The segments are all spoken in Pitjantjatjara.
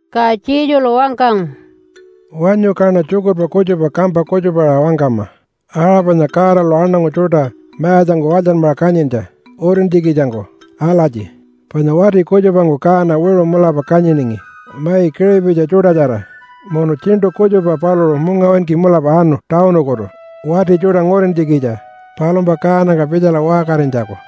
Ka Jesulu wangkangu, “Wanyu, kaṉa tjukurpa kutjupa kampa kutjupaṟa wangkama aṟa panya Godalu aṉangu tjuṯa mayatjangku walytjanmaṟa kanyintja utintjikitjangku alatji, panya wati kutjupangku kaana wiṟu mulapa kanyiningi mai kiṟipitji tjuṯatjara. Munu tjiṉṯu kutjupa paluṟu mungawinki mulapa anu tawunukutu wati tjuṯa ngurintjikitja palumpa kaanangka pitjala waṟkarinytjaku.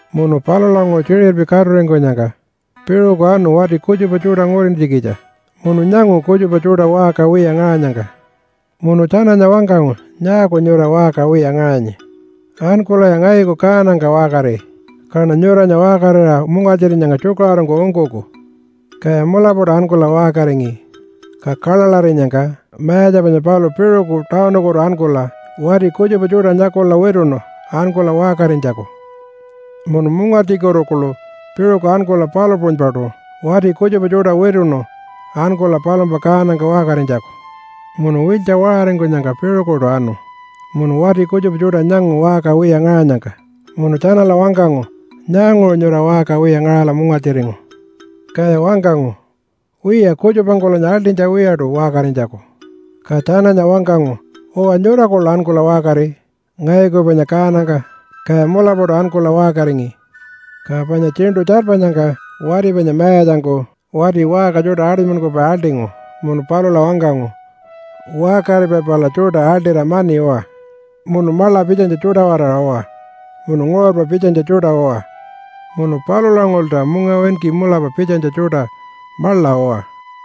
Munu palulanguṟu tjiṟirpi katuringkunyangka piṟuku anu wati kutjupa tjuṯa ngurintjikitja, munu nyangu kutjupa tjuṯa waṟka wiya ngaṟanyangka. Munu tjananya wangkangu, ‘Nyaaku nyura waṟka wiya ngaṟanyi? Ankulaya ngayuku kaanangka waṟkari, kaṉa nyuranya waṟkarira mungartjirinyangka tjukaṟurungku ungkuku.’ Kaya mulapaṯu ankula waṟkaringi. Ka kaḻaḻarinyangka mayatja panya paluṟu piṟuku tawunukutu ankula wati kutjupa tjuṯa nyakula wituṉu ankula waṟkarinytjaku. Munu mungartjikutu kuḻu piṟuku ankula palu puṟunypaṯu wati kutjupa tjuṯa wituṉu ankula palumpa kaanangka waṟkarinytjaku. Munu wiltja waṟaringkunyangka piṟukuṯu anu munu wati kutjupa tjuṯa nyangu waṟka wiya ngaṟanyangka. Munu tjanala wangkangu, ‘Nyaanguṟu nyura waṟka wiya ngaṟala mungartjiringu?’ Kaya wangkangu, ‘Wiya, kutjupangkulanya aḻṯinytja wiyaṯu waṟkarinytjaku.’ Ka tjananya wangkangu, ‘Uwa, nyura kuḻu ankula waṟkari ngayuku panya kaanangka.’ Kaya mulapaṯu ankula waṟkaringi. Ka panya tjiṉṯu tjarpanyangka wati panya mayatjangku wati waṟka tjuṯa aṯunymankupai aḻṯingu munu palula wangkangu, ‘Waṟkaripai pala tjuṯa aḻṯira mani uwa. Munu maḻa pitjanytja tjuṯa-waraṟa uwa, munu nguṟurpa pitjanytja tjuṯa uwa munu palulanguṟulta mungawinki mulapa pitjanytja tjuṯa maḻa uwa.’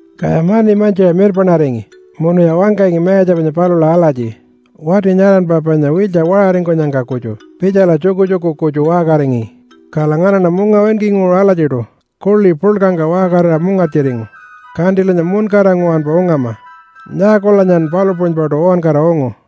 Kaya mani mantjiṟa mirpaṉaringi munuya wangkangi mayatja panya palula alatji, ‘Wati nyaranpa panya wiltja waṟaringkunyangka kutju pitjala tjukutjuku kutju waṟkaringi, kala nganaṉa mungawinkinguṟu alatjiṯu kuḻi puḻkangka waṟkarira mungartjiringu, kantilanyan muṉkara nguwanpa ungama. Nyaakulanyan palu puṟunypaṯu uwankara ungu?’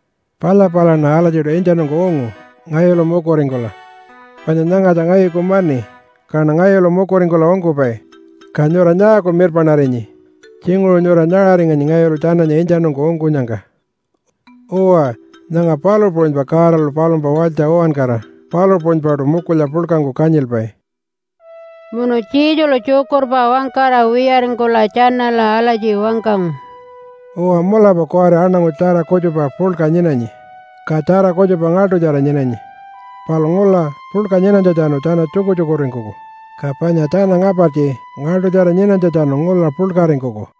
Palya palaṉa alatjiṯu intjanungku ungu ngayulu mukuringkula, panya nyangatja ngayuku mani kaṉa ngayulu mukuringkula ungkupai. Ka nyura nyaaku mirpaṉarinyi? Tjinguṟu nyura nyaṟaringanyi ngayulu tjananya intjanungku ungkunyangka.’ Uwa, nyanga palu puṟunypa Godalu palumpa walytja uwankara palu puṟunypaṯu mukulya puḻkangku kanyilpai.” Munu Jesulu tjukurpa wangkara wiyaringkula tjanala alatji wangkangu, “Uwa, mulapa kuwari aṉangu tjara kutjupa puḻka nyinanyi, ka tjara kutjupa ngaḻṯutjara nyinanyi. Palu ngula puḻka nyinanytjatjanu tjana tjukutjukuringkuku, ka panya tjana ngapartji ngaḻṯutjara nyinanytjatjanu ngula puḻkaringkuku.”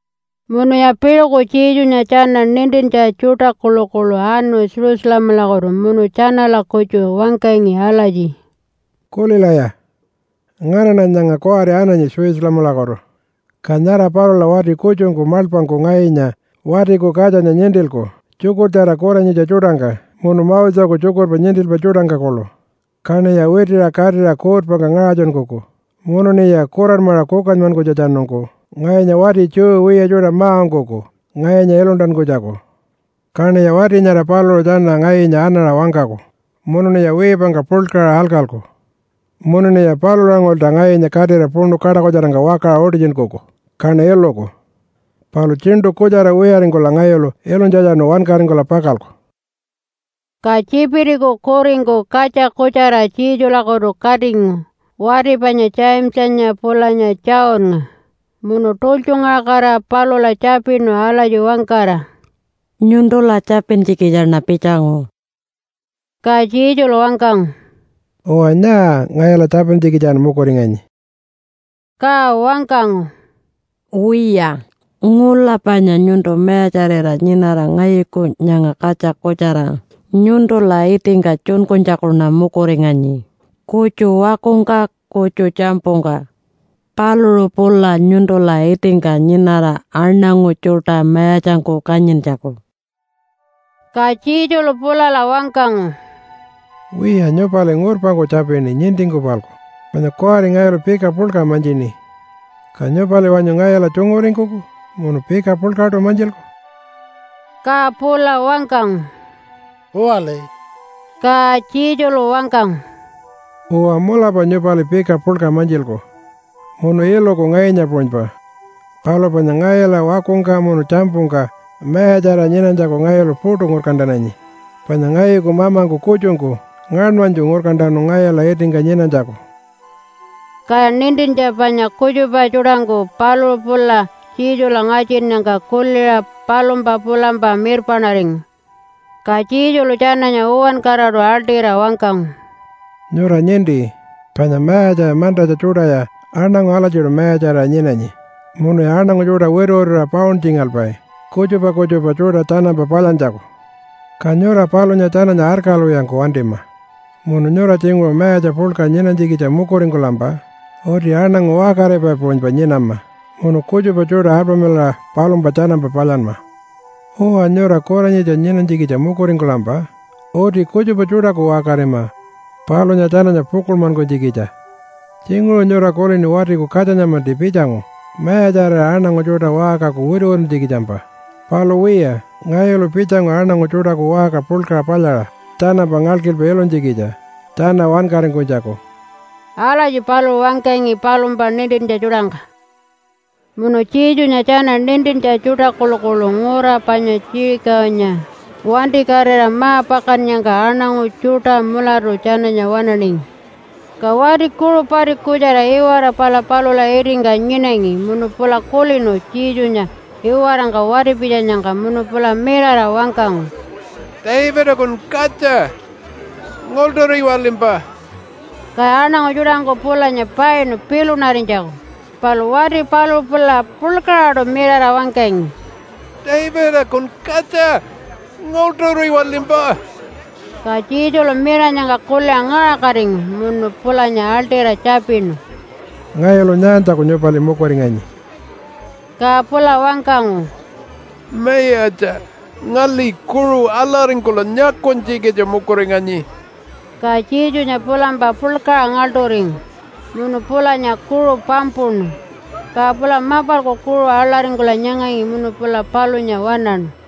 Munuya piṟuku Jesunya tjana nintintja tjuṯa kuḻukuḻu anu Jerusalemalakutu munu tjanala-kutju wangkangi alatji “Kulilaya! Nganaṉa nyanga kuwari ananyi Jerusalemalakutu, ka nyara palula wati kutjungku maḻpangku ngayunya Watiku Katjanya nintilku tjukurtjara kuranyitja tjuṯangka munu Moseku tjukurpa nintilpai tjuṯangka kuḻu, kaṉiya witiṟa katira kuutpangka ngaṟatjunkuku munuṉiya kuranmaṟa kukanymankunytjatjanungku ngayunya wati Jew wiya tjuṯa ma-ungkuku ngayunya iluntankunytjaku. Kaṉiya wati nyara paluṟu tjana ngayunya anaṟa wangkaku, munuṉiya wiipangka puḻkaṟa alkalku, munuṉiya palulanguṟulta ngayunya katira puṉu kaṯakutjarangka wakaṟa utitjunkuku, kaṉa iluku. Palu tjiṉṯu kutjara wiyaringkula ngayulu ilunytjatjanu wankaringkula pakalku.” Ka Tjipitiku kuringku katja kutjara Jesulakutu katingu wati panya Jamesanya pulanya Johnnga, munu tultjungaṟakatira palula tjapinu alatji wangkara, “Nyuntula tjapintjikitjaṉa pitjangu.” Ka Jesulu wangkangu, “Uwa, nyaa ngayula tjapintjikitjan mukuringanyi?” Ka wangkangu, “Wiya, ngula panya nyuntu mayatjarira nyinara, ngayuku nyanga katja kutjara nyuntula itingka tjunkunytjakuṉa mukuringanyi, kutju wakungka, kutju tjampungka, paluṟu pula nyuntula itingka nyinara, aṉangu tjuṯa mayatjangku kanyintjaku.” Ka Jesulu pulala wangkangu, “Wiya nyupali ngurpangku tjapini nintingku-palku. Panya kuwari ngayulu pika puḻka mantjini. Ka nyupali wanyu ngayula tjunguringkuku munu pika puḻkaṯu mantjilku?” Ka pula wangkangu, “Uwali.” Ka Jesulu wangkangu, “Uwa, mulapa nyupali pika puḻka mantjilku munu iluku ngayunya puṟunypa. Palu panya ngayula wakungka munu tjampungka mayatjarira nyinanytjaku ngayulu puṯu ngurkantananyi, panya ngayuku mamangku kutjungku ngaṉmanytju ngurkantanu ngayula itingka nyinanytjaku.” Kaya nintintja panya kutjupa tjuṯangku paluṟu pula Jesula ngatjinnyangka kuliṟa palumpa pulampa mirpaṉaringu. Ka Jesulu tjananya uwankaraṯu aḻṯira wangkangu, “Nyura ninti panya mayatja mantatja tjuṯaya aṉangu alatjiṯu mayatjarira nyinanyi munuya aṉangu tjuṯa wituwituṟa pauntjingalpai kutjupa kutjupa tjuṯa tjanampa palyantjaku. Ka nyura palunya tjananya arkalwiyangku wantima. Munu nyura tjinguṟu mayatja puḻka nyinanytjikitja mukuringkulampa uti aṉangu waṟkaripai puṟunypa nyinama munu kutjupa tjuṯa alpamilaṟa palumpa tjanampa palyanma. Uwa, nyura kuranyitja nyinanytjikitja mukuringkulampa uti kutjupa tjuṯaku waṟkarima palunya tjananya pukuḻmankunytjikitja. Tjinguṟu nyura kulini Watiku Katjanya-manti pitjangu mayatjarira aṉangu tjuṯa waṟkaku wituwituntjikitjampa. Palu wiya, ngayulu pitjangu aṉangu tjuṯaku waṟka puḻka palyaṟa tjanampa ngalkilpa ilunytjikitja tjana wankaringkunytjaku.” Alatji paluṟu wangkangi palumpa nintintja tjuṯangka. Munu Jesunya tjana nintintja tjuṯa kuḻukuḻu ngura panya Jerichonya wantikatira ma-pakannyangka aṉangu tjuṯa mulatu tjananya waṉaningi. Ka wati kuṟu pati kutjara iwara pala palula itingka nyinangi munu pula kulinu Jesunya iwarangka wati-pitjanyangka munu pula mirara wangkangu, “Davidakun katja! Ngaḻṯuriwalimpa!” Kaya aṉangu tjuṯangku pulanya painu pilunarinytjaku. Palu wati paluṟu pula puḻkaṟaṯu mirara wangkangi, “Davidakun katja! Ngaḻṯuriwalimpa!” Ka Jesulu miranyangka kuliṟa ngaṟakatingu munu pulanya aḻṯira tjapinu, “Ngayulu nyaantjaku nyupali mukuringanyi?” Ka pula wangkangu, “Mayatja! Ngali kuṟu aḻaringkula nyakunytjikitja mukuringanyi.” Ka Jesunya pulampa puḻkaṟa ngaḻṯuringu, munu pulanya kuṟu pampuṉu, ka pula mapalku kuṟu aḻaringkula nyangangi munu pula palunya waṉaṉu.